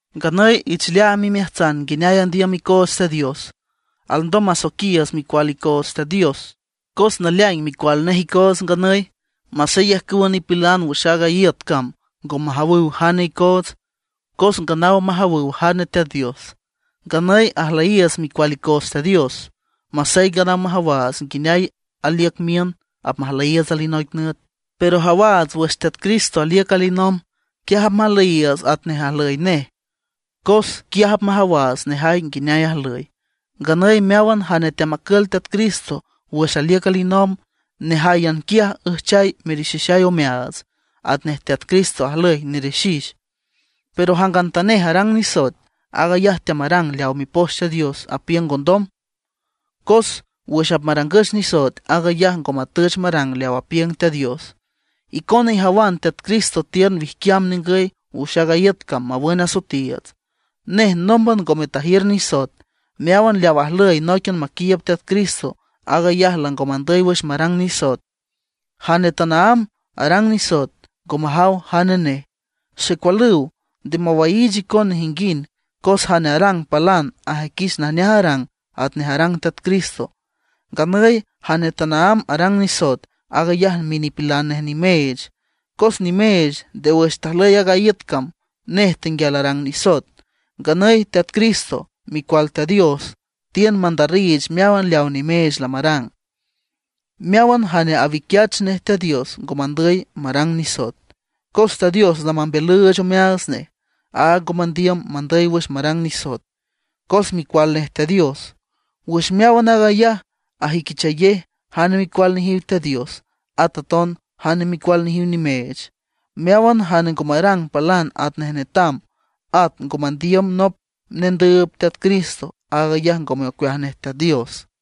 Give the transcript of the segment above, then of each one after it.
Nganüy ich leaam imeajtsan nguineay andiüm icoots Teat Dios. Alndom masoiquiiüts micual Teat Dios icoots, cos naleaing micual nej icoots nganüy. Masey ajcüwa nipilan wüx aaga iüt cam ngo majawüw jane icoots, cos nganaw majawüw jane Teat Dios. Nganüy ajlüyiiüts micual icoots Teat Dios, masey nganaw majawaats nguineay aliüc miün apmajlüyiiüts alinoic nüt. Pero ajawaats wüx Teat Cristo aliüc alinomb, quiaj apmajlüyiiüts atnej ajlüy nej, cos quiaj apmajawaats nejay nguineay ajlüy. Nganüy meáwan jane teamacül Teat Cristo wüx aliüc alinomb, nejáyan quiaj üjchay merixixay omeaats, atnej Teat Cristo ajlüy nerixix. Pero jangantanej arang nisoet, aag ayaj teamarang leaw Mipoch Teat Dios apiüng ngondom; cos wüx apmarangüch nisoet aag ayaj ngo matüch marang leaw apiüng Teat Dios. Icona ijawan Teat Cristo tiün wijquiam ningüy wüx aaga iüt cam mawün asoetiiüts. Nej nómban ngome tajiür nisoet. Meáwan leaw ajlüy nóiquian maquiiüb Teat Cristo, aag ayaj lango mandüy wüx marang nisoet. Jane tanaámb arang nisoet ngo majaw jane nej. Xecualüw, nde mawaiich icon nejinguind, cos jane arang palan ajüiquich najneaj arang, atnej arang Teat Cristo. Nganüy jane tanaámb arang nisoet, aag ayaj minipilan nej nimeech, cos nimeech nde wüx tajlüy aaga iüt cam nej tenguial arang nisoet. Nganüy Teat Cristo, Micual Teat Dios, tiün mandarriich meáwan leawa nimeech lamarang. Meáwan jane awiquiach nej Teat Dios ngo mandüy marang nisoet, cos Teat Dios lamambiülüüch omeaats nej. Áag ngo mandiüm mandüy wüx marang nisoet, cos micual nej Teat Dios. Wüx meáwan aag ayaj ajüiquichayej jane micual nejiw Teat Dios, at aton jane micual nejiw nimeech. Meáwan jane ngo marang palan atnej netam, at ngo mandiüm nop nendüüb Teat Cristo, aag ayaj ngome ocueaj nej Teat Dios.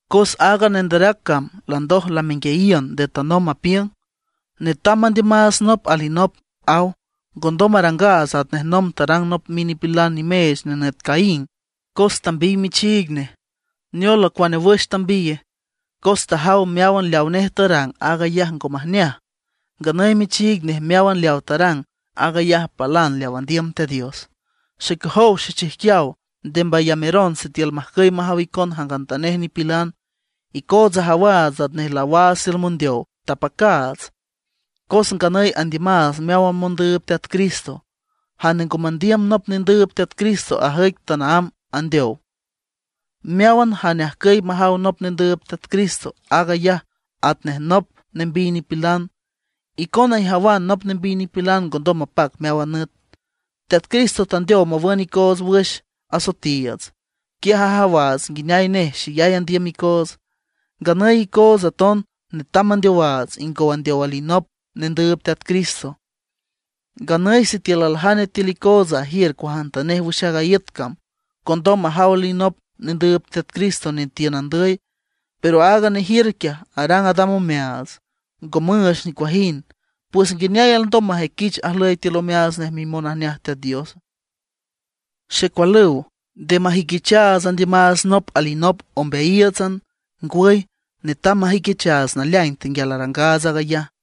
Cos aaga nanderac cam landoj lamenguiayiün nde tanomb apiüng: “Netam mandiümaats nop alinop”, aw. Ngondom marangaats atnej nomb tarang nop minipilan nimeech nenüt Caín, cos tambiy michiig nej. ¿Neola, cuane wüx tambiye? Cos tajaw meáwan leawa nej tarang, aag ayaj ngo majneaj; nganüy michiig nej meáwan leawa tarang, aag ayaj palan leaw andiüm Teat Dios. Xecojow xechijquiaw, nde mbayameron sitiül majcüy majaw icon jangantanej nipilan. Icootsa ajawaats atnej laawaats tiül mondeow, tapacaats; cos nganüy andiümaats meáwan mondüüb Teat Cristo. Jane ngo mandiüm nop nendüüb Teat Cristo ajüic tanaámb andeow. Meáwan jane ajcüy majaw nop nendüüb Teat Cristo, aag ayaj atnej nop nembiy nipilan. Icona ijawan nop nembiy nipilan ngondom mapac meáwan nüt. Teat Cristo tandeow mawün icoots wüx asoetiiüts; quiaj ajawaats nguineay nej xeyay andiüm icoots. Nganüy icoots aton netam mandeowaats ingow andeow alinop nendüüb Teat Cristo. Nganüy sitiül aljane tiül icoots ajiür cuajantanej wüx aaga iüt cam, condom ajaw alinop nendüüb Teat Cristo netiün andüy, pero aaga nejiür quiaj arang adam omeaats, ngo müüch nicuajind; pues ¿nguineay alndom majüiquich ajlüy tiül omeaats nej mimonajneaj Teat Dios? Xecualüw, nde majüiquichaats andiümaats nop alinop ombeayíiütsan; ngwüy, netam majüiquichaats naleaing tenguial arangaats aag ayaj.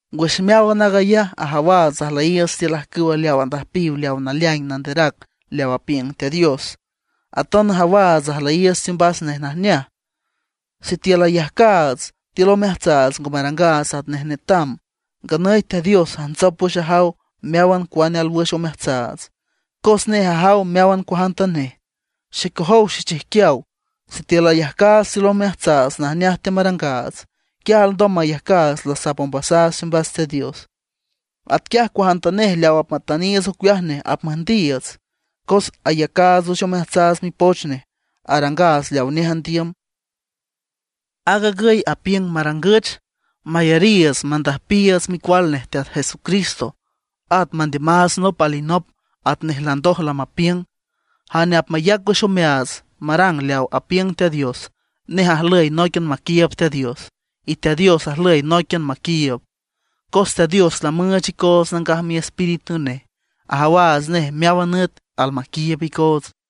Wüx meáwan aag ayaj ajawaats ajlüyiiüts tiül ajcüw leaw andüjpiw aaga naleaing nanderac leaw apiüng Teat Dios. Aton ajawaats ajlüyiiüts teombas nej najneaj. Sitiül ayajcaats tiül omeajtsaats ngo marangaats atnej netam, nganüy Teat Dios ajntsop wüx ajaw meáwan cuane alwüx omeajtsaats, cos nej ajaw meáwan cuajantanej. Xecojow xechijquiaw, sitiül ayajcaats tiül omeajtsaats najneaj teamarangaats, quiaj alndom mayajcaats lasap ombasaats teombas Teat Dios. Atquiaj cuajantanej leaw apmatüniiüts ocueaj nej apmüjndiiüts, cos ayacaats wüx omeajtsaats mipoch nej; arangaats leawa nej andiüm. Aag agüy apiüng marangüch: Mayariiüts mandüjpiiüts Micual nej Teat Jesucristo; at mandiümaats nop alinop atnej landoj lamapiüng. Jane apmayac wüx omeaats marang leaw apiüng Teat Dios, nej ajlüy nóiquian maquiiüb Teat Dios, y Teat Dios ajlüy nóiquian maquiiüb. Cos Teat Dios lamüüch icoots Nangaj Miespíritu nej, ajawaats nej meáwan nüt almaquiiüb icoots.